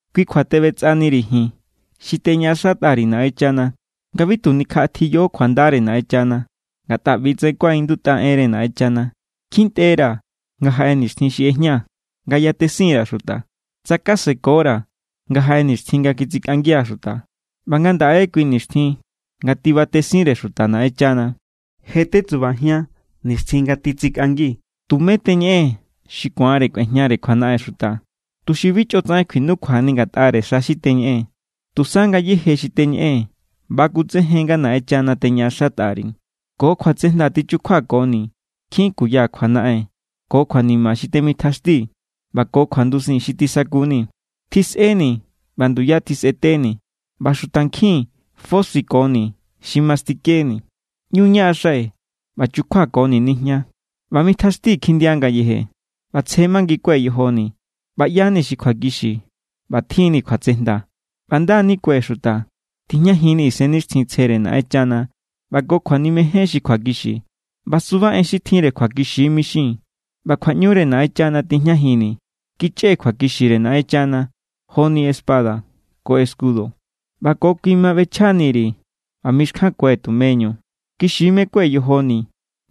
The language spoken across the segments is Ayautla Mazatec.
Kui kjua teꞌbetsꞌaniri̱ ji̱n xi teñaꞌaxatꞌa_ri̱ Naꞌenchana nga bi tu nikjaꞌatiyo kjuandare Naꞌenchana. Ngatꞌa ꞌbi=tsaꞌen kuaꞌindutꞌa enre Naꞌenchana: Kjintꞌera̱ nga jaꞌe nixtjin xi ꞌejñaa̱ nga yatesin_ra̱ xuta, tsakasekora̱ nga jaꞌe nixtjin nga kitsikꞌangia̱ xuta. ꞌBa ngandaꞌe= kui nixtjin nga tibatesinre xuta Naꞌenchana. Je= tesubajian nixtjin nga titsikꞌangi. Tumé teñeꞌee̱n xi ku̱anre kꞌuejñare kjuanaꞌen xuta, tuxi bi chꞌotsaꞌen kjuinukjuani ngatꞌare xa xi teñeꞌee̱n. Tusa ngayéje xi teñeꞌee̱n bakutsejen nga Naꞌenchana teñaꞌaxatꞌa_ri̱. Ko kjuatsejnda tichukjuakoni̱ nkjin kuya kjuanaꞌen ko kjuanima xi temitjaxtii̱ ꞌba ko kjuandusin xi tisakuni̱. Tisꞌeni̱ ꞌba nduya tisꞌeteni̱ ꞌba xutankjin fosiꞌakoni̱ xi mastikeni̱. ꞌÑu ñaꞌaxai̱ ꞌba chukjuakoni̱ nijña ꞌba mitjaxtii̱ kjindia ngayeje. ꞌBa tsje mangikue̱ yojoni̱, ꞌba ꞌya=ni xi kjuakixi, ꞌba tjinni̱ kjuatsejnda, ꞌba nda= nikue̱ xuta. Tijñajinni̱ Isennixtjintsjere Naꞌenchana ꞌba ko kjuanimejen xi kjuakixi. ꞌBa suba en xi tjinre kjuakixi= mixii̱n, ꞌba kjuaꞌñure Naꞌenchana tijñajinni̱. Kichꞌee̱ kjuakixire Naꞌenchana joni espada ko escudo. ꞌBa ko kui ma ꞌbechja_ri̱ ꞌba mixkjankue̱ tumeñu. Kixi= mekue̱ yojoni̱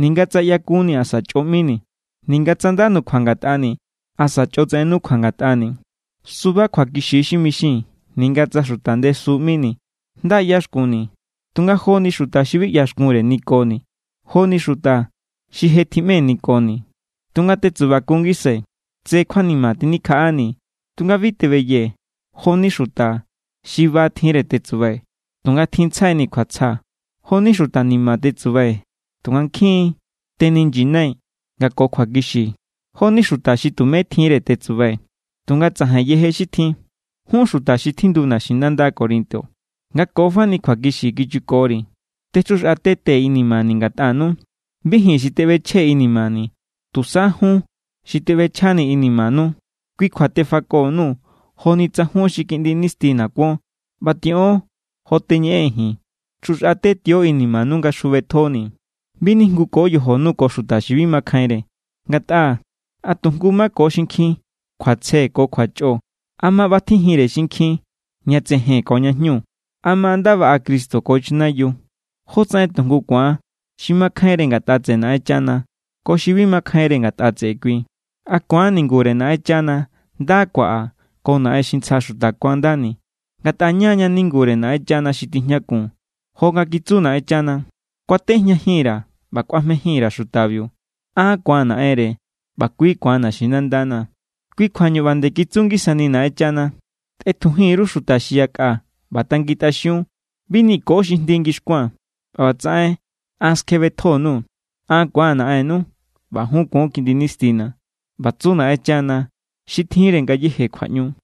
ninga tsa ꞌyakunni̱ asa chꞌo ꞌmini̱, ninga tsa nda nukjua ngatꞌani̱ asa chꞌotsaꞌen nukjua ngatꞌani̱. Suba kjuakixi= xi mixii̱n, ninga tsa xuta ndesu ꞌmini̱. Nda ꞌyaxkunni̱, tunga joni xuta xi bi ꞌyaxkunre nikoni̱. Jo=ni xuta xi je tjiꞌme nikoni̱, tunga tetsubakun ngisai̱. Tse kjuanima tjinikjaꞌani̱, tunga bi tebeyee̱. Jo=ni xuta xi ba tjinre tetsubai̱, tunga tjinntsjaini̱ kjuatsja. Jo=ni xuta ni̱ma̱ tetsubai̱, tunga nkjin= teninyinai̱ nga ko xi kjuakixi. Jo=ni xuta xi tumé tjinre tetsubai̱, tunga tsajain yeje xi tjin. Jun xuta xi tjindu naxinanda Corinto, nga ko fani kjuakixi kichukori̱. Techjuxꞌatetee̱ inimani̱ ngatꞌanu. Bi ji̱n xi teꞌbechjee̱ inimani̱, tusa jun xi teꞌbechjanii̱ inimanu. Kui kjua tefako_nuu̱ joni tsa jun xi kiꞌndi nistina̱ kuon. ꞌBa tiꞌon jo teñeꞌee̱n ji̱n. Chjuxꞌatetio inimanu nga chjubetjonii̱. Bi nijnguko yojonu ko xuta xi bi makjainre. Ngatꞌa, ¿a tu jngu= mako xinkjin kjuatsje ko kjuachꞌo? ¿A ma ꞌbatjijinre xinkjin ña tsejen ko ña jñu? ¿A ma nda baꞌa Cristo ko chanayiu? ¿Jótsaꞌen tujngu ku̱an xi makjainre ngatꞌa tseꞌe Naꞌenchana ko xi bi makjainre ngatꞌa tseꞌe kui? ¿A ku̱an ningure Naꞌenchana nda kuaꞌa ko naꞌen xi ntsja xuta kuandani? Ngatꞌa ña=ña ningure Naꞌenchana xi tijñakun, jo nga kitsu Naꞌenchana: Kuatejñajin_ra̱ ꞌba kꞌuajmejin_ra̱ xutabiu. An ku̱an Naꞌenre ꞌba kui ku̱an naxinandana̱. Kui kjuañu ꞌba nde kitsu ngisani Naꞌenchana: Tꞌetjujin_ru xuta xi yakꞌa ꞌba tangintꞌaxiun. Bi niko xi jndi ngixkuaa̱n, ꞌba ꞌbatsaꞌen an skjebetjo_nuu̱. An ku̱aa̱n Naꞌennu, ꞌba jun kuon kiꞌndi nistina̱. ꞌBa tsu Naꞌenchana xi tjinre ngayéje kjuaꞌñu.